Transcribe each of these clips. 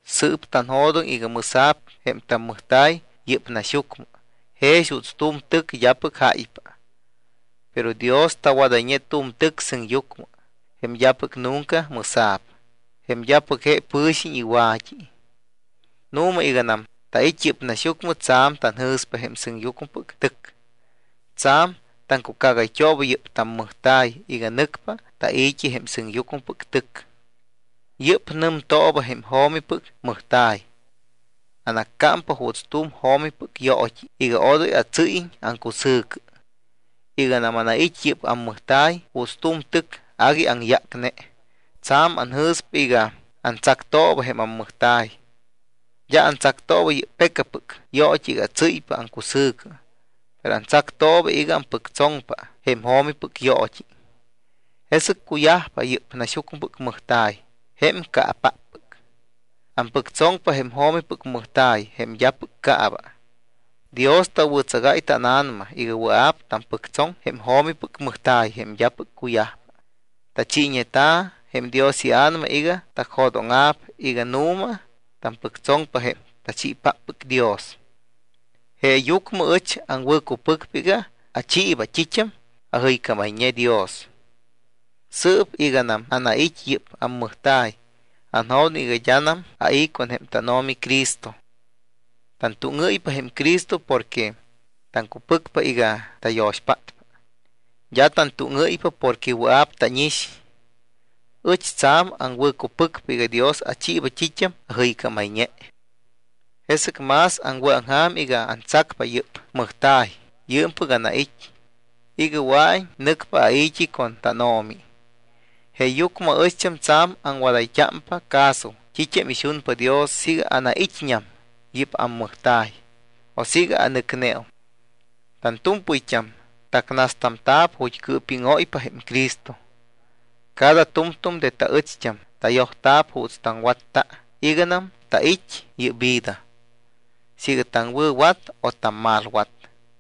Sɨɨp tanjo̱doŋ iga mɨsa̱p jém tammɨjta̱y yɨ́p naxyucmɨ jex juuts tu̱m tɨc d́apɨc jáypa. Pero Dios tawadayñe tu̱m tɨc sɨŋyucmɨ, jém d́apɨc nunca mɨsa̱p, jém d́apɨc je pɨ̱xiñ iwa̱t́i. Nu̱ma, iganam tait́ yɨ́p naxyucmɨ tsa̱m tanjɨ̱spa jém sɨŋyucmɨpɨc tɨc. Tsa̱m taŋcucágayt́ooba yɨ́p tammɨjta̱y iga nɨcpa tai̱t́i jém sɨŋyucmɨpɨc tɨc. Yɨ́p nɨmtooba jém jo̱mipɨc mɨjta̱y. Anaccámpa juuts tu̱m jo̱mipɨc yoot́i iga odoy atsɨ́yiñ aŋcusɨ̱cɨ. Iganam anait́ yɨ́p ammɨjta̱y juuts tu̱m tɨc agui aŋyácne, tsa̱m anjɨ̱spa iga antsactooba jém ammɨjta̱y. D́a antsactooba yɨ́p pecapɨc yoot́i iga atsɨ́ypa aŋcusɨ̱cɨ, pero antsactooba iga ampɨctsoŋpa jém jo̱mipɨc yoot́i. Jesɨc cuyajpa yɨ́p naxyucmɨpɨc mɨjta̱y, jém caapáppɨc, ampɨctsoŋpa jém jo̱mipɨc mɨjta̱y jém d́apɨc caaba. Dios tawɨ̱tsagáy tána̱nama iga wɨa̱p tampɨctsoŋ jém jo̱mipɨc mɨjta̱y jém d́apɨc cuyajpa. Tachiiñeta̱ jém Dios iA̱nama iga tacjo̱dóŋa̱p iga nu̱ma tampɨctsoŋpa jém tachiipáppɨc Dios. Jeeyucmɨ ɨch aŋwɨ̱cupɨcpa iga achiiba t́it́am ajɨycámayñe Dios. Sɨɨp iganam anait́ yɨ́p ammɨjta̱y, anjo̱doŋ iga d́anam ai̱ con jém tánO̱mi Cristo. Tantúŋɨ́ypa jém Cristo porque taŋcupɨcpa iga tayo̱xpátpa. D́a tantúŋɨ́ypa porque wɨa̱p tánix. Ɨch tsa̱m aŋwɨ̱cupɨcpa iga Dios achiiba t́it́am ajɨycámayñe. Jesɨc más aŋwɨ̱aŋja̱m iga antsacpa yɨ́p mɨjta̱y yɨɨmpɨc anait́ iga wɨa̱iñ nɨcpa ai̱t́i con tánO̱mi. Jeeyucmɨ aɨcht́am tsa̱m aŋwadayt́ámpa caso t́it́am ixunpa Dios siiga anait́ñam yɨ́p ammɨjta̱y, o siiga anɨcneum. Tantu̱mpɨyt́am tacnastamta̱p ju̱t́ cɨɨpíŋóypa jém Cristo. Cada tu̱mtu̱m de taɨcht́am tayojta̱p juuts taŋwatta iganam tait́ yɨ́p vida. Siiga taŋwɨ̱wat o tammalwat.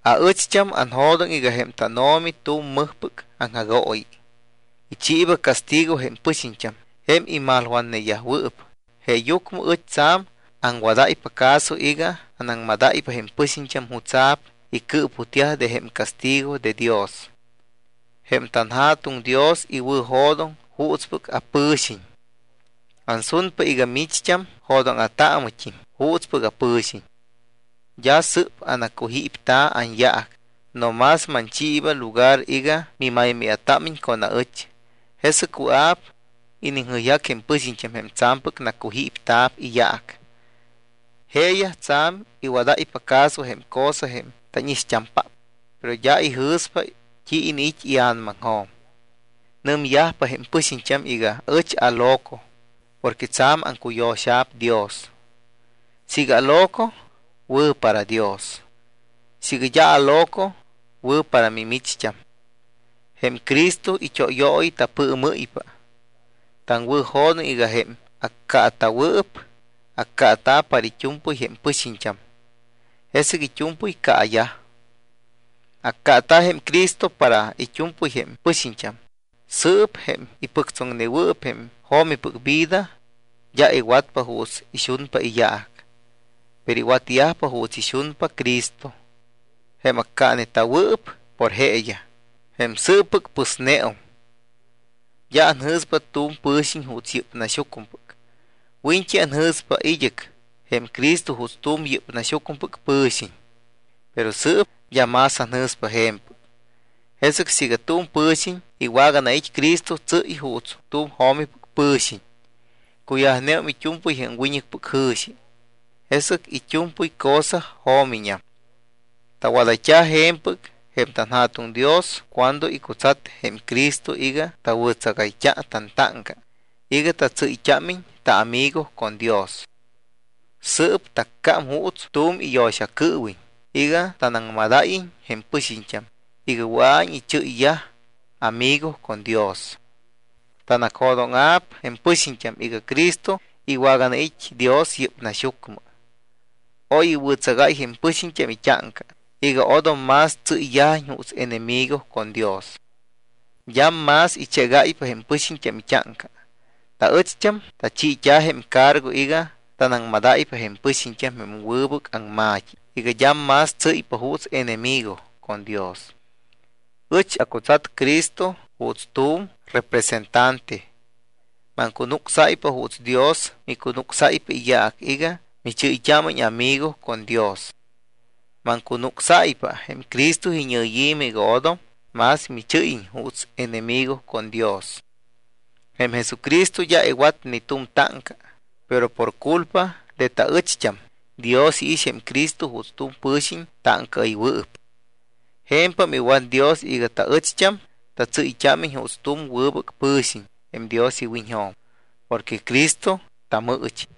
Aɨcht́am anjo̱doŋ iga jém tánO̱mi tu̱m mɨjpɨc aŋjagooyi, ichiiba castigo jém pɨxiñt́am jém imalwatneyajwɨɨp. Jeeyucmɨ ɨch tsa̱m aŋwadáypa caso iga anaŋmadáypa jém pɨxiñt́am jutsa̱p icɨɨputyaj de jém castigo de Dios. Jém tanJa̱tuŋ Dios iwɨ̱jo̱doŋ juutspɨc apɨ̱xiñ. Ansunpa iga micht́am jo̱dóŋa̱taamɨt́im juutspɨc apɨ̱xiñ. D́a sɨ́p anacujípta̱ anyaac, no más manchiiba lugar iga mimaymáya̱támiñ con aɨcht́am, jesɨc wɨa̱p iniŋjɨyjac jém pɨxiñt́am jém tsa̱mpɨc nacujípta̱p iyaac. Jeeyaj tsa̱m iwadáypa caso jém cosa jém tánixt́ampáppɨc, pero d́a ijɨ̱spa t́i iniit́ ia̱namaŋjo̱m. Nɨmyajpa jém pɨxiñt́am iga ɨch aloco porque tsa̱m aŋcuyo̱xa̱p Dios. Siiga aloco, wɨ̱ para Dios. Siiga d́a aloco, wɨ̱ para mimicht́am. Jém Cristo it́óyooyi tapɨɨmɨ́ypa. Taŋwɨ̱jo̱doŋ iga jém accaata̱wɨɨp accaata̱ para it́u̱mpɨy jém pɨxiñt́am, jesɨc it́u̱mpɨy caayaj. Accaata̱ jém Cristo para it́u̱mpɨy jém pɨxiñt́am. Sɨɨp jém ipɨctsoŋnewɨɨp jém jo̱mipɨc vida d́a iwatpa juuts ixunpa iyaac, pero iwatyajpa juuts ixunpa Cristo, jém accaaneta̱wɨɨp por jeeyaj, jém sɨɨppɨc pɨsneum. D́a anjɨ̱spa tu̱m pɨ̱xiñ juuts yɨ́p naxyucmɨpɨc. Wiñɨc anjɨ̱spa id́ɨc jém Cristo juuts tu̱m yɨ́p naxyucmɨpɨc pɨ̱xiñ, pero sɨɨp d́a más anjɨ̱spa je̱mpɨc. Jesɨc siiga tu̱m pɨ̱xiñ iwaganait́ Cristo, tsɨ́y juuts tu̱m jo̱mipɨc pɨ̱xiñ. Cuyajneum it́u̱mpɨy jém wiñɨcpɨc jɨ̱xi, jesɨc it́u̱mpɨy cosa jo̱miñam. Tawadayt́a je̱mpɨc jém tanJa̱tuŋ Dios cuando icutsat jém Cristo iga tawɨ̱tsagayt́a tantáŋca iga tatsɨ́yt́ámiñ taamigo con Dios. Sɨɨp taccám juuts tu̱m iyo̱xacɨɨwiñ iga tanaŋmadáyiñ jém pɨxiñt́am iga wɨa̱iñ ichɨ́yyaj amigo con Dios. Tanacjo̱dóŋa̱p jém pɨxiñt́am iga Cristo iwaganait́ Dios yɨ́p naxyucmɨ. Oy iwɨ̱tsagáy jém pɨxiñt́am it́áŋca iga odom más tsɨ́yyajiñ juuts enemigo con Dios. D́am más ichégáypa jém pɨxiñt́am it́áŋca. Taɨcht́am tachiit́a jém cargo iga tanaŋmadáypa jém pɨxiñt́am jém wɨbɨc aŋma̱t́i iga d́am más tsɨ́ypa juuts enemigo con Dios. Ɨch acutsat Cristo juuts tu̱m representante. Maŋcunucsáypa juuts Dios micunucsáypa iyaac iga michɨ́yt́ámiñ amigo con Dios. Maŋcunucsáypa jém Cristo iñɨyi̱mɨ iga odom más michɨ́yiñ juuts enemigo con Dios. Jém Jesucristo d́a iwat ni t́u̱m táŋca, pero por culpa de taɨcht́am, Dios iix jém Cristo juuts tu̱m pɨ̱xiñ táŋcaɨywɨɨp. Je̱mpam iwat Dios iga taɨcht́am tatsɨ́yt́ámiñ juuts tu̱m wɨbɨc pɨ̱xiñ jém Dios iwiñjo̱m porque Cristo tamɨɨchi.